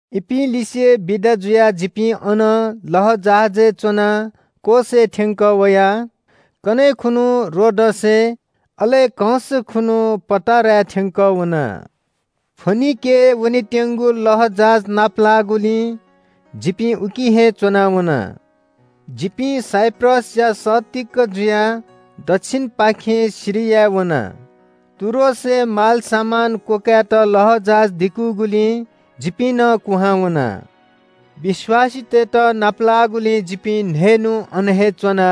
इपिं लिसे बिदा जुयाः जिपिं अनं लःजहाजय् च्‍वनाः कोसय् थ्‍यंकः वयाः कन्‍हय् खुन्‍हु रोडसय्, अले कंस खुन्‍हु पटाराय् थ्‍यंकः वना। फोनिकेय् वनेत्‍यंगु लःजहाज नाप लाःगुलिं जिपिं उकी हे च्‍वनाः वना। जिपिं साइप्रसया सत्तीक जुयाः दच्‍छिनपाखें सिरिया वना। टुरोसय् मालसामान क्‍वकाय्‌त लःजहाज दिकूगुलिं जिपिं नं कुहां वना। विश्‍वासीतय्‌त नाप लाःगुलिं जिपिं न्‍हय्‌न्‍हु अन हे च्‍वना।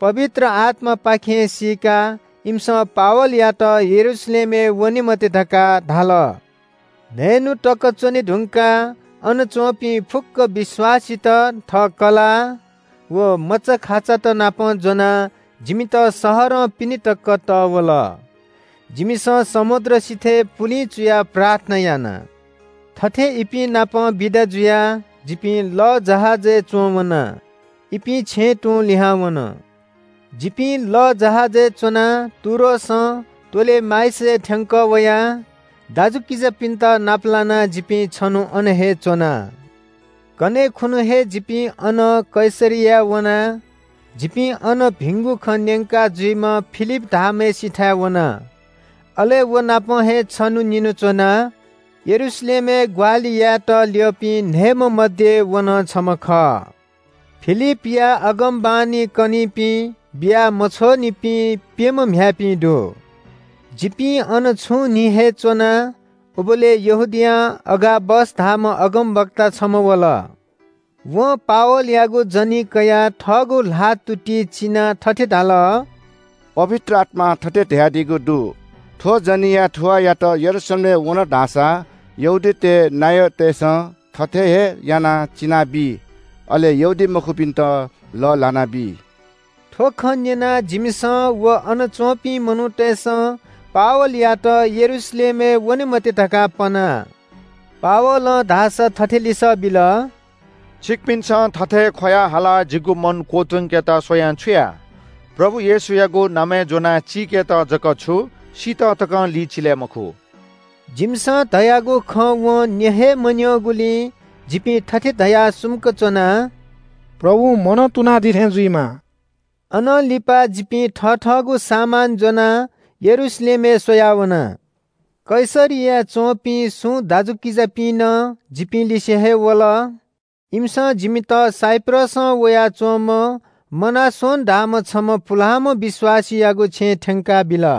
पवित्र आत्‍मापाखें सीकाः इमिसं पावलयात यरूशलेमय् वने मते धकाः धाल। न्‍हय्‌न्‍हु तक च्‍वने धुंकाः अन च्‍वंपिं फुक्‍क विश्‍वासीत थः कलाः व मचाखाचातनापं ज्‍वनाः जिमित शहरं पिने तक तः वल। जिमिसं समुद्र सिथय् पुलिं चुयाः प्रार्थना याना। थथे इपिं नाप बिदा जुयाः जिपिं लःजहाजय् च्‍वं वना। इपिं छेँय् तुं लिहां वन। जिपिं लःजहाजय् च्‍वनाः टुरोसं टोलेमाइसय् थ्‍यंकः वया। दाजुकिजापिन्‍त नाप लानाः जिपिं छन्‍हु अन हे च्‍वना। कन्‍हय् खुन्‍हु हे जिपिं अनं कैसरियाय् वना। जिपिं अन भिंगु खँ न्‍यंका जुइम्‍ह फिलिप धाःम्‍हय्‌सिथाय् वना। अले व नाप हे छन्‍हु निन्‍हु च्‍वना। यरूशलेमय् ग्‍वाहालि यायेत ल्‍यःपिं न्‍हय्‌म्‍ह मध्‍ये व नं छम्‍ह खः। फिलिपया अगमवाणी कनीपिं, बिया मछ्वःनिपिं प्‍यम्‍ह म्‍ह्याय्‌पिं दु। जिपिं अन छुं न्‍हि हे च्‍वना। उबलय् यहूदियां अगाबस धाःम्‍ह अगमवक्ता छम्‍ह वल। वं पावलयागु जनी कयाः थःगु ल्‍हाःतुति चिनाः थथे धाल – “पवित्र आत्‍मां थथे धयादीगु दु – ‘थ्‍व जनीया थुवाःयात यरूशलेमय् वन धाःसा यहूदीतय् नायःतय्‌सं थथे हे यानाः चिनाबी, अले यहूदीमखुपिन्‍त लःल्‍हानाबी।’” थ्‍व खँ न्‍यनाः जिमिसं व अन च्‍वंपिं मनूतय्‌सं पावलयात यरूशलेमय् वने मते धकाः पना। पावलं धाःसा थथे लिसः बिल – “छिकपिन्‍सं थथे ख्‍वयाः हालाः जिगु मन क्‍वतुंकेत स्‍वयां छु याये? प्रभु येशूयागु नामय् ज्‍वनाः चिकेत जक छु सीत तकं लिचिले मखु।” जिमिसं धयागु खँ वं न्‍यँ हे मन्‍यंगुलिं जिपिं थथे धयाः सुम्‍क च्‍वना – “प्रभुं मनं तुनादीथें जुइमा।” अनं लिपा जिपिं थथःगु सामान ज्‍वनाः यरूशलेमय् स्‍वया वना। कैसरियाय् च्‍वंपिं सुं दाजुकिजापिं नं जिपिं लिसे हे वल। इमिसं जिमित साइप्रसं वयाच्‍वंम्‍ह मनासोन धाःम्‍ह छम्‍ह पुलांम्‍ह विश्‍वासीयागु छेँय् थ्‍यंकाबिल।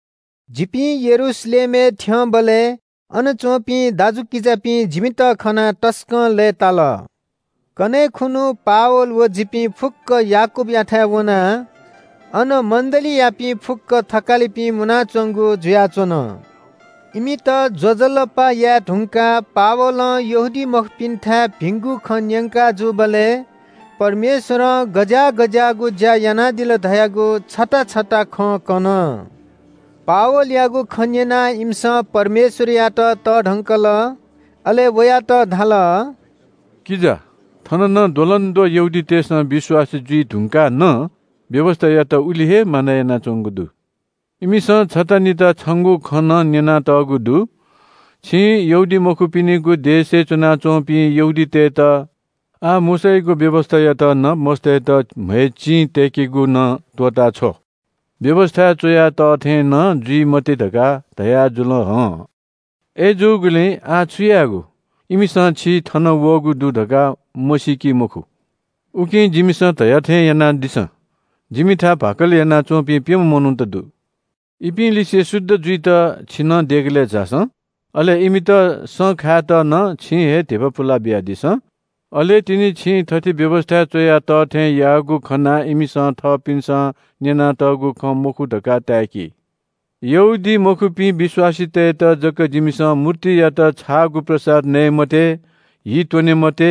जिपिं यरूशलेमय् थ्‍यंबलय् अन च्‍वंपिं दाजुकिजापिं जिमित खनाः तसकं लय्‌ताल। कन्‍हय् खुन्‍हु पावल व जिपिं फुक्‍क याकूबयाथाय् वना। अन मण्‍डलीयापिं फुक्‍क थकालिपिं मुनाच्‍वंगु जुयाच्‍वन। इमित ज्‍वजलपा याये धुंकाः पावलं यहूदीमखुपिन्‍थाय् भिंगु खँ न्‍यंका जूबलय् परमेश्‍वरं गज्‍याः गज्‍याःगु ज्‍या यानादिल धयागु छता छता खँ कन। पावलयागु खँ न्‍यनाः इमिसं परमेश्‍वरयात तःधंकल। अले वयात धाल – “किजा, थन नं द्वलंद्वः यहूदीतय्‌सं विश्‍वासी जुइ धुंकाः नं व्‍यवस्‍थायात उलि हे मानय् यानाच्‍वंगु दु। इमिसं छता निता छंगु खँ नं न्‍यनातःगु दु। छिं यहूदीमखुपिनिगु देशय् च्‍वनाच्‍वंपिं यहूदीतय्‌त ‘आः मोशायागु व्‍यवस्‍थायात नं मस्‍तय्‌त म्‍हय् चिं तय्‌केगु नं त्‍वःताछ्व, व्‍यवस्‍थाय् च्‍वया तः थें नं जुइ मते’ धकाः धयाजुल हं। अय्‌जूगुलिं आः छु यायेगु? इमिसं छि थन वःगु दु धकाः मसीकी मखु। “उकिं जिमिसं धया थें यानादिसँ। जिमिथाय् भाकल यानाच्‍वंपिं प्‍यम्‍ह मनूत दु। इपिं लिसे शुद्ध जुइत छि नं देगलय् झासँ। अले इमित सँ खायेत नं छिं हे धिबा पुलाबिया दिसँ। अले तिनि छिं थथे व्‍यवस्‍थाय् च्‍वया तः थें याःगु खनाः इमिसं थःपिन्‍सं न्‍यनातःगु खँ मखु धकाः ताय्‌की। “यहूदीमखुपिं विश्‍वासीतय्‌त जक जिमिसं ‘मूर्तियात छाःगु प्रसाद नये मते, हि त्‍वने मते,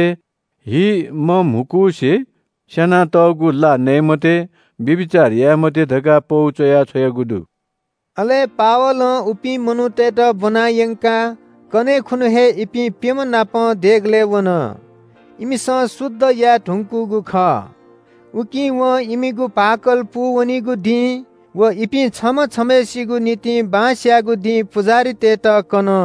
हि मम्‍हुकुसे स्‍यानातःगु ला नये मते, व्‍यभिचार याये मते’ धकाः पौ च्‍वया छ्वयागु दु।” अले पावलं उपिं मनूतय्‌त ब्‍वना यंकाः कन्‍हय् खुन्‍हु हे इपिं प्‍यम्‍ह नाप देगलय् वन। इमिसं शुद्ध याये धुंकूगु खः। उकी वं इमिगु भाकल पूवनीगु दिं व इपिं छम्‍ह छम्‍हय्‌सिगु निंतिं बां स्‍यायेगु दिं पुजाहारीतय्‌त कन।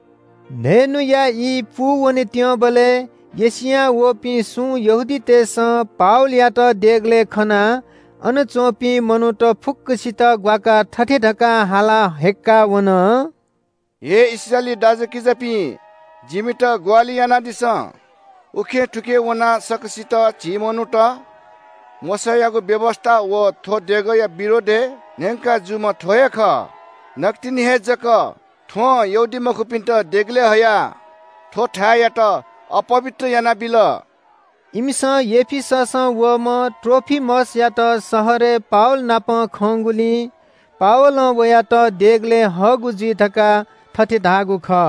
न्‍हय्‌न्‍हुया ई पूवनेत्‍यंबलय् एशियां वःपिं सुं यहूदीतय्‌सं पावलयात देगलय् खनाः अन च्‍वंपिं मनूत फुक्‍कसित ग्‍वाकाः थथे धकाः हालाः हय्‌क्‍काः वन – “हे इस्राएली दाजुकिजापिं, जिमित ग्‍वाहालि यानादिसँ। उखेंथुखें वनाः सकसितं झी मनूत, मोशायागु व्‍यवस्‍था व थ्‍व देगःया विरोधय् न्‍यंका जूम्‍ह थ्‍व हे खः। नकतिनि हे जक थ्‍वं यहूदीमखुपिन्‍त देगलय् हयाः थ्‍व थाय्‌यात अपवित्र यानाबिल।” इमिसं एफिससं वःम्‍ह त्रोफिमसयात शहरय् पावल नाप खंगुलिं पावलं वयात देगलय् हःगु जुइ धकाः थथे धाःगु खः।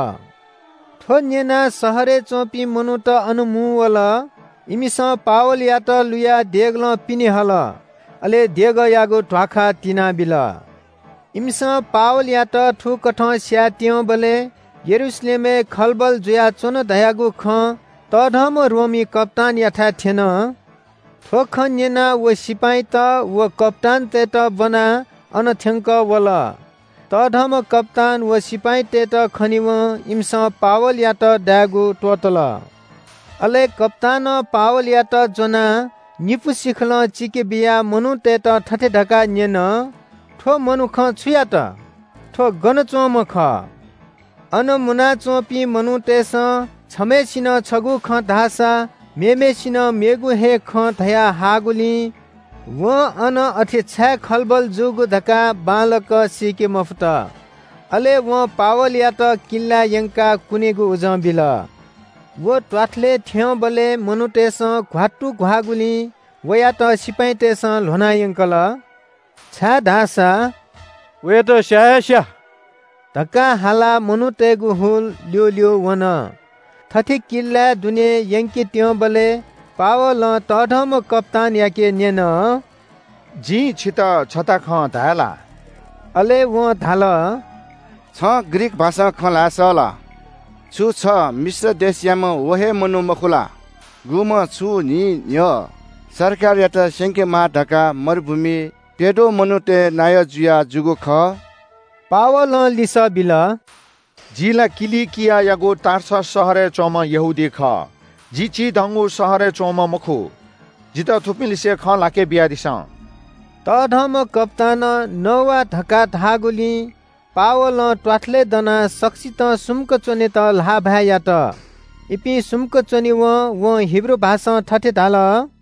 थ्‍व न्‍यनाः शहरय् च्‍वंपिं मनूत अन मुंवल। इमिसं पावलयात लुयाः देगलं पिने हल। अले देगःयागु ध्‍वाखा तिनाबिल। इमिसं पावलयात थुकथं स्‍यायेत्‍यंबलय् यरूशलेमय् खलबल जुयाच्‍वन धयागु खँ तःधंम्‍ह रोमी कप्‍तानयाथाय् थ्‍यन। थ्‍व खँ न्‍यनाः व सिपाइँत व कप्‍तानतय्‌त ब्‍वनाः अन थ्‍यंकः वल। तःधंम्‍ह कप्‍तान व सिपाइँतय्‌त खनेवं इमिसं पावलयात दायेगु त्‍वःतल। अले कप्‍तानं पावलयात ज्‍वनाः निपु सिखलं चिकेबियाः मनूतय्‌त थथे धकाः न्‍यन – “थ्‍व मनुखं छु यात? थ्‍व गन च्‍वंम्‍ह खः?” अन मुनाच्‍वंपिं मनूतय्‌सं छम्‍हय्‌सिनं छगू खँ धाःसा मेम्‍हय्‌सिनं मेगु हे खँ धया हाःगुलिं वं अन अथे छाय् खलबल जूगु धकाः बांलाक सीके मफुत। अले वं पावलयात किल्‍लाय् यंकाः कुनेगु उजं बिल। व त्‍वाथलय् थ्‍यंबलय् मनूतय्‌सं घ्‍वात्तुघ्‍वाःगुलिं वयात सिपाइँतय्‌सं ल्‍ह्वना यंकल। छाय्‌धाःसा “वयात स्‍या हे स्‍या” धकाः हालाः मनूतय्‌गु हुल ल्‍यूल्‍यू वन। थथे किल्‍लाय् दुने यंकेत्‍यंबलय् पावलं तःधंम्‍ह कप्‍तानयाके न्‍यन – “जिं छितः छता खँ धाये ला?” अले वं धाल – “छं ग्रीक भाषां खँ ल्‍हाये सः ला? छु छ मिश्र देशयाम्‍ह व हे मनू मखु ला? गुम्‍ह छुं न्‍हि न्‍ह्यः सरकारयात स्‍यंकेमाः धकाः मरुभूमिइ प्‍यद्वः मनूतय् नायः जुयाजूगु खः?” पावलं लिसः बिल – “जि ला किलिकियागु टार्सस शहरय् च्‍वंम्‍ह यहूदी खः। जि चिधंगु शहरय् च्‍वंम्‍ह मखु। जितः थुपिंलिसे खँ ल्‍हाके बियादिसँ।” तःधंम्‍ह कप्‍तानं “नवा” धकाः धाःगुलिं पावलं त्‍वाथलय् दनाः सकसितं सुम्‍क च्‍वनेत ल्‍हाःभाय् यात। इपिं सुम्‍क च्‍वनेवं वं हिब्रू भाषां थथे धाल –